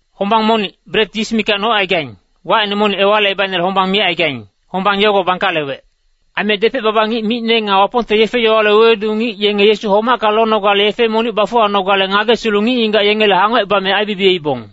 Hombang monic, bret yis mikac nocaigaing, wacine monic Ewalicebaicnele hombang micaigaing, hombang yogo bangkalewec. Aime depec-baba ngic micne nga Wapongte yefe-yowale wewedu ngic, yenge Yesu homacka lonogale yefe monic bafuwanogale ngagesilu ngic-ngigac yengele hangocebame aibibiyeibong.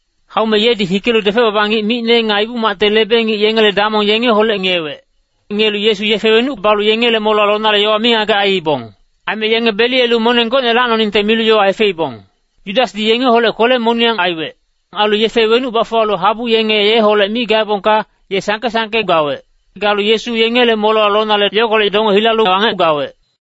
Haume yedi hikelu depec-baba ngic micne nga Ibu-macte lebe-ngic yengele damong yengeholec ngiyewec. Ngiyelu Yesu yefe wenuc balu yengele molewa lonale yowa mingagec aiibong. Aime yenge beliyelu moneng gocne lacnoningte milu yowa hefeibong. Yudasdi yengeholec kwele-moniyang aiwec. Ailu yefe wenuc bafuwalu habu yenge yeholec mi gaebongka, ye sangke-sangke gawec. Galu Yesu yengele molewa lonale, yogolec donge hilalu wangec gawec.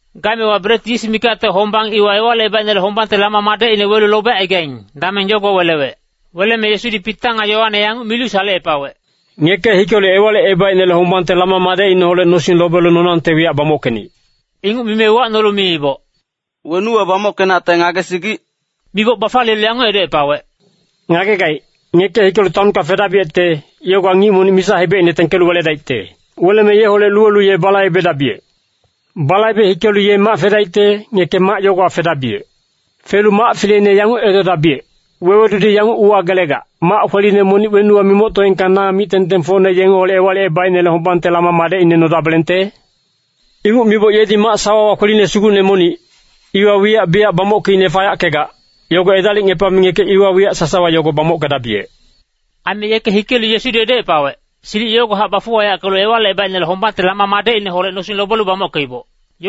Gaemewa bret yis mikacte hombang iwa Ewalicebaicnele hombangte lama madecine welu lobecaigaing, dameng yogo welewec. Weleme Yesudi Pita nga Yoane yanguc milu salecepawec, “Ngeke hikelu Ewalicebaicnele hombangte lama madecineholec nosing lobelu nonangte wiyac bamockenic!” Inguc mime uwacnolu miiboc, “Wenuwa bamockenacte ngagesigic?” Miboc bafaliyelu yanguc edocepawec, “Ngagegaic, ngeke hikelu taonka fedabiyecte, yogowa ngic monic misa-hebecine tengkelu weledaicte. Weleme yeholec luwelu ye balaibedabiyec. Balaibe hikelu ye mac fedaicte, ngeke mac yogowa fedabiyec. Felu mac fileine yanguc edodabiyec, ‘Wewedudi yanguc uwagelegac, “Mac kweline monic wenuwa mimoctoengka na mic-tengtengfocne yengeholec Ewalicebaicnele hombangte lama madecine nodabelengte?” ’ Inguc miboc yedi mac sawawa kweline sugucne monic, iwa wiyac biyac bamockeicne fayackegac, yogo edalicngepame ngeke iwa wiyac sasawa yogo bamockedabiyec.” Aime yeke hikelu Yesudi edocepawec, silic yogohac bafuwayackelu Ewalicebaicnele hombangte lama madecineholec nosing lobelu bamockeiboc.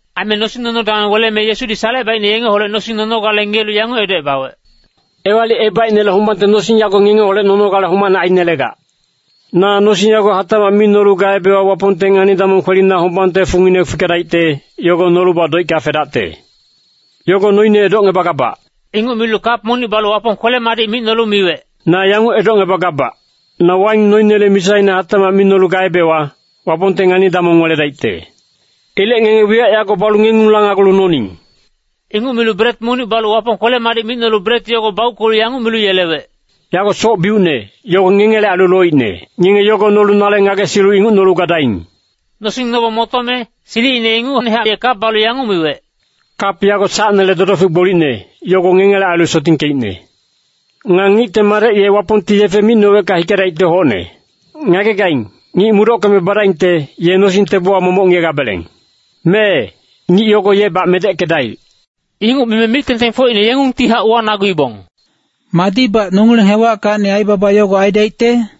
Aime nosing-nono dameng weleme Yesudi Salecebaicne yengeholec nosing nonogale ngiyelu yanguc edocebawec, “Ewalicebaicnele hombangte nosing yago ngengeholec nonogale homacne ainelegac. Na nosing yago hatacmac mi nolu gaebewa Wapongte ngani-damong kwelina hombangte fungine fikedaicte, yogo nolubac doicka fedacte. Yogo noine edocngebagabac.” Inguc milu kap monic balu Wapong kwele-madic micnolu miwec, “Na yanguc edocngebagabac, na waing noinele misaine hatacmac mi nolu gaebewa, Wapongte ngani-damong weledaicte. Ilec ngenge wiyac yago balu ngengung lanagulu noning.” Inguc milu bret monic balu Wapong kwele-madic micnolu bret yogo bauckelu yanguc milu yelewec, “Yago soc-biucne, yogo ngengele ailu loicne. Ngenge yogo nolu nale ngagesilu inguc nolu gadaing!” Nosing nobong motome, silicine ingucnehac ye kap balu yanguc miwec, “Kap yago sacnele dodofic gbolicne, yogo ngengele ailu sotingkeicne. “Nga Ngicte Madec ye Wapongti yefe micnowecka hikedaicte hocne. Ngagegaing, ngic mudockeme badaingte, ye nosing tebowa momoc ngiyegabeleng. Mee, ngic yogo yebac medeckedaic.” Inguc mime mic-tengtengfocine yengungtihac uwanaguibong, “Madibac nongileng hewackacni aibaba yogo aidaicte?”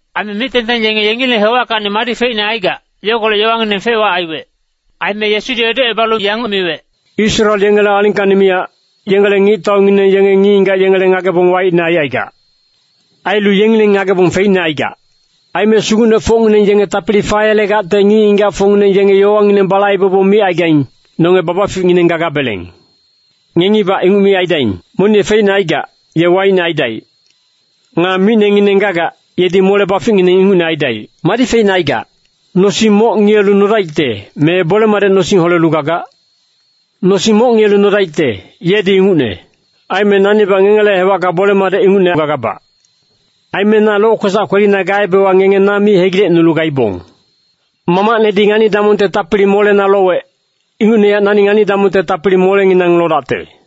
Aime mic-tengteng yenge yengileng hewackacni madi feicne gagac, yogolec yowangineng fec-wac aiwec. Aime Yesudi edocebalu yanguc miwec, “Israel yengele alingkacni miyac, yengele ngictaungineng yenge ngic-ngigac yengele ngagebong waicne aicaigac. Ailu yengileng ngagebong feicne aigac. Aime sugucnefocngineng yenge tapili fayelegacte ngic-ngigacfocngineng yenge yowangineng balaibebong micaigaing, ‘Nonge babaficngineng gagabeleng.’ “Ngengibac inguc mi aidaing! Monic ye feicne aigac, ye waicne aidaic. Nga micnengineng gagac, yedi mole-baficngineng ingucne aidaic. Madi feicne aigac? Nosing moc ngiyelu nodaicte, me bole-madec nosing holelu gagac? Nosing moc ngiyelu nodaicte, yedi ingucne. Aime nanibac ngengele hewacka bole-madec ingucne gagabac. Aime na lokwesac kwelina gaebewa ngenge na mi hegilecnulu gaibong. Mamacnedi ngani-damongte tapili molena lowec, ingucnehac nani ngani-damongte tapili molenginang lodacte.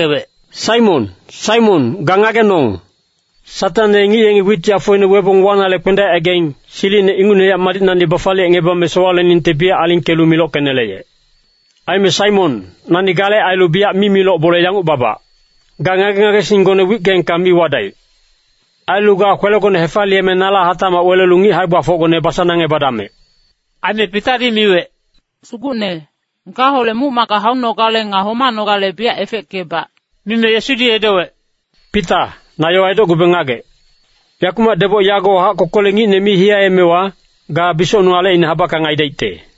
“Saimon, Saimon, ga ngagenong. Satang ye ngic yengi wit yafoine webong wanale kpendaecaigaing, silicine ingucnehac madicnacni bafaliyecngebame sowaleningte biyac alingkelu milockeneleyec. Aime Saimon, nani gale ailu biyac mimiloc bole yanguc babac. Ga ngage-ngagesinggone wickeengka mi wadaic. Ailu ga kwelegone hefaliyeme nala hatacmac welelu ngic hae-gbafocgone basanangebadamec!” Aime Pitadi miwec, “Sugucne, gaholec muc-macka haunogale nga homanogale biyac efeckebac.” Mime Yesudi edowec, “Pita, na yowa edocgube ngagec. Yakumac deboc yagowahac kokolec ngicne mi hiyaemewa, ga bisocnung alecine habackang aidaicte.”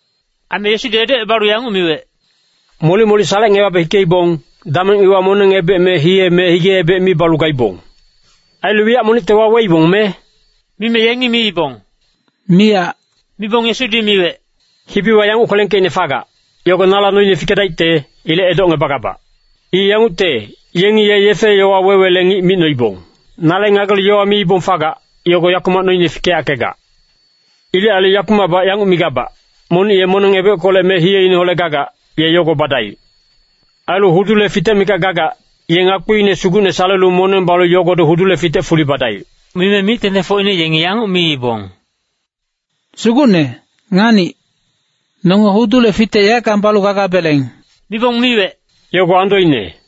Aime Yesudi edocebalu yanguc miwec, “Molic-molic salecngebabe hikeibong, dameng iwa moneng-ebec me hiye me hige-ebec mi balu gaibong. Ailu wiyac monicte waweibong me?” Mime yengi miibong, “Miyac.” Mibong Yesudi miwec, “Hibiwa yanguc kwelengkeicne fagac, yogo nala noine fikedaicte, ilec edocngebagabac. I yangucte, ‘Yengi ye yefe-yowa wewele ngic micnoibong.’ Nale ngagelu yowa miibong fagac, yogo yakumac noine fikeyackegac. Ilec ailu yakumacbac yanguc migabac, monic ye moneng-ebeckolec me hiyeineholec gagac, ye yogo badaic. Ailu hudule fitec mikac gagac, ye ngakpiine sugucne salelu moneng balu yogodi hudule fitec fuli badaic.” Mime mic-tengtengfocine yengi yanguc miibong, “Sugucne, nganic. Nonge hudule fitec yaeckang balu gagabeleng.” Mibong miwec, “Yogo andoine.”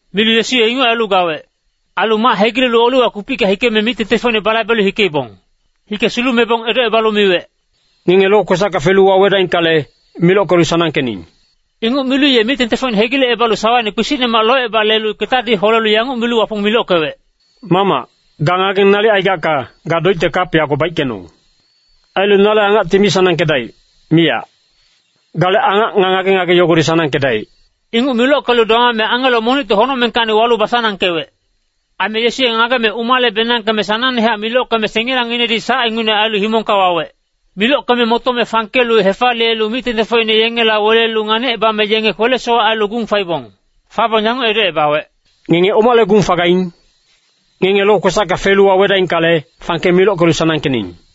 Milu Yesu ye inguc ailu gawec. Ailu mac hegilelu Oliwa kupicka hikeme mic-tengtengfocine balaibelu hikeibong. Hike sulumebong edocebalu miwec, “Ngenge lokwesacka felu wawedaingkale, milockelu sanangkening!” Inguc milu ye mic-tengtengfocine hegilecebalu sawaine kpisicnemac loceba lelu ketadi holelu yanguc milu Wapong milockewec, “Mamac, ga ngageng nalic aigacka, ga doicte kap yago baickenong. Ailu nale angacti mi sanangkedaic, miyac. Gale angac nga ngage-ngage yogodi sanangkedaic.” [Inguc milockelu domame angelo monicti honocmengkacni walu basanangkewec. Aime Yesu ye ngageme umale-benangkeme sanangnehac milockeme sengilangnginedi sac ingucne ailu himongka wawec.] Milockeme motome fangkelu hefaliyelu mic-tengtengfocine yengela welelu nganicebame yenge kwele-sowac ailu gung faibong. Fabong yanguc edocebawec, “Ngenge omale gung fagaing? Ngenge lokwesacka felu wawedaingkale, fangke milockelu sanangkening!”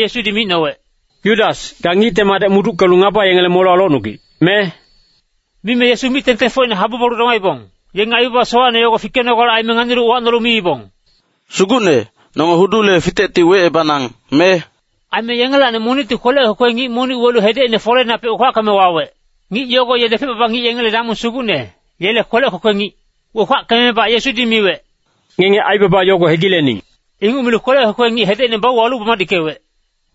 Yesudi micnowec, “Yudas, ga Ngicte Madec muduckelu ngaba yengele molewa locnugic, me?” Mime Yesu mic-tengtengfocine habu balu domaibong, yenge aibaba sowacne yogo fikenogale aime nganilu uwacnolu miibong, “Sugucne, nonge hudule fitecti wecebanang, me?” Aime yengelacni monicti kwelec kwekwe ngic monic welu hedecine foleinapec wekwackeme wawec. Ngic yogo ye depec-baba ngic yengele damong sugucne, yele kwelec kwekwe ngic. Wekwackemebac Yesudi miwec, “Ngenge aibaba yogo hegilening!” Inguc milu kwelec kwekwe ngic hedecine bauwalu bamadickewec.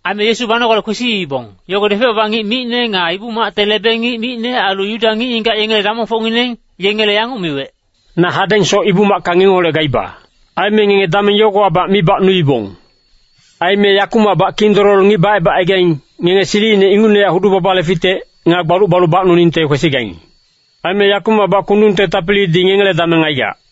Aime Yesu banogale kwesiibong, yogo depec-baba ngic micne nga Ibu-macte lebe-ngic micne, ailu Yuda ngic-ngigac yengele damongfocngineng, yengele yanguc miwec, “Na hadengsoc Ibu-macka ngengeholec gaiba. Aime ngenge dameng yogowabac mi bacnuibong. Aime yakumacbac kindololo ngic bacebacaigaing, ngenge silicine ingucnehac hudu-babale fitec, nga gbaluc balu bacnuningte kwesigaing. Aime yakumacbac kundungte tapilidi ngengele dameng aigac.”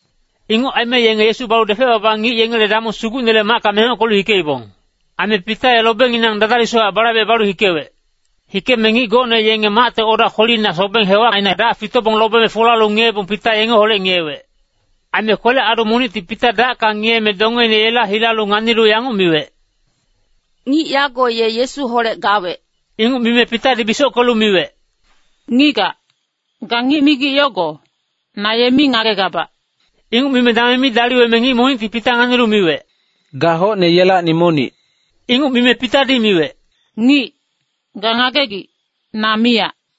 Inguc aime yenge Yesu balu depec-baba ngic yengele damong sugucnele macka mengockelu hikeibong. Aime Pita ye lobenginang dadalisuchac balaibecebalu hikewec. Hikeme ngic gocne yenge macte oda kwelina sobeng hewacina dac fitobong lobeme folalu ngiyebong, Pita yengeholec ngiyewec. Aime kwelec-adu monicti Pita dacka ngiyeme, dongeine yela hilalu nganilu yanguc miwec, “Ngic yago ye Yesuholec gawec.” Inguc mime Pitadi bisockelu miwec, “Ngigac, ga ngic migic yogo, na ye mi ngagegabac.” Inguc mime dameng mi daliweme ngic monicti Pita nganilu miwec, “Ga hocne yengelacni monic.” Inguc mime Pitadi miwec, “Ngic, ga ngagegic, na miyac.”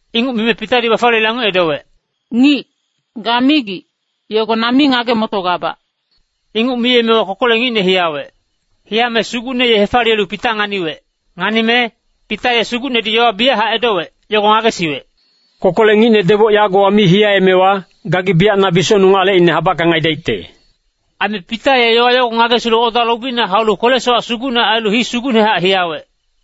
Inguc mime Pitadi bafaliyelu yanguc edowec, “Ngic, ga migic, yogo na mi ngage-motogabac.” Inguc miyemewa kokolec ngicne hiyawec. Hiyame Sugucne ye hefaliyelu Pita nganiwec. Nganime, Pita ye Sugucnedi yowa biyachac edowec, yogo ngagesiwec, “Kokolec ngicne deboc yagowa mi hiyaemewa, gagi biyac na bisocnung alecine habackang aidaicte.” Aime Pita ye yowa yogo ngagesilu oda lobina haulu kwele-sowac sugucne ngagelu hii sugucnehac hiyawec.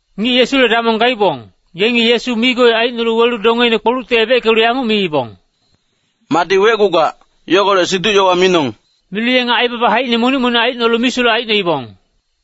Ngic Yesule damong gaibong, yengi Yesu migoi aicnolu welu dongeine kpolucti ebeckelu yanguc miibong, “Madi wecgugac, yogolec siduc-yowa minong!” Milu yenge aibaba haicine monic-monic aicnolu misulec aicnoibong.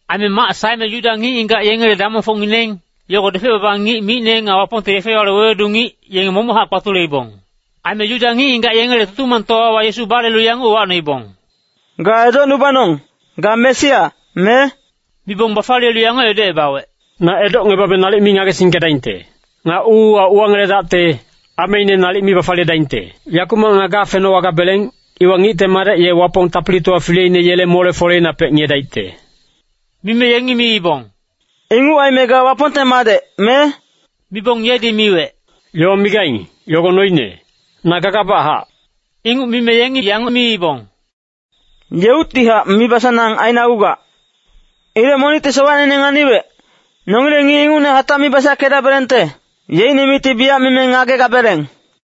Aime mac saeme Yuda ngic-ngigac yengele damongfocngineng, yogo depec-baba ngic micne nga Wapongte yefe-yowale wewedu ngic, yenge momochac kpatuleibong. Aime Yuda ngic-ngigac yengele Tutumangtowawa Yesu balelu yanguc uwacnoibong, “Ga edocnubanong. Ga Mesia, me?” Mibong bafaliyelu yanguc edocebawec, “Na edocngebabe nalic mi ngagesingkedaingte. Nga uuwa uwangeledacte, ameine nalic mi bafaliyedaingte. Yakumac nga gafenowagabeleng, iwa Ngicte Madec ye Wapong Tapilitowa fileine yele mole-foleinapec ngiyedaicte.” Mime yengi miibong, “Inguc aime ga Wapongte Madec, me?” Mibong yedi miwec, “Yowa migaing, yogo noine. Na gagabachac.” Inguc mime yengi yanguc miibong, “Yeuctihac mibasanang ainagugac. Ilec monicti sowacneine nganiwec, nongileng ngic ingucne hatac mi basackedabelengte. Yeicne micti biyac mime ngagegabeleng.”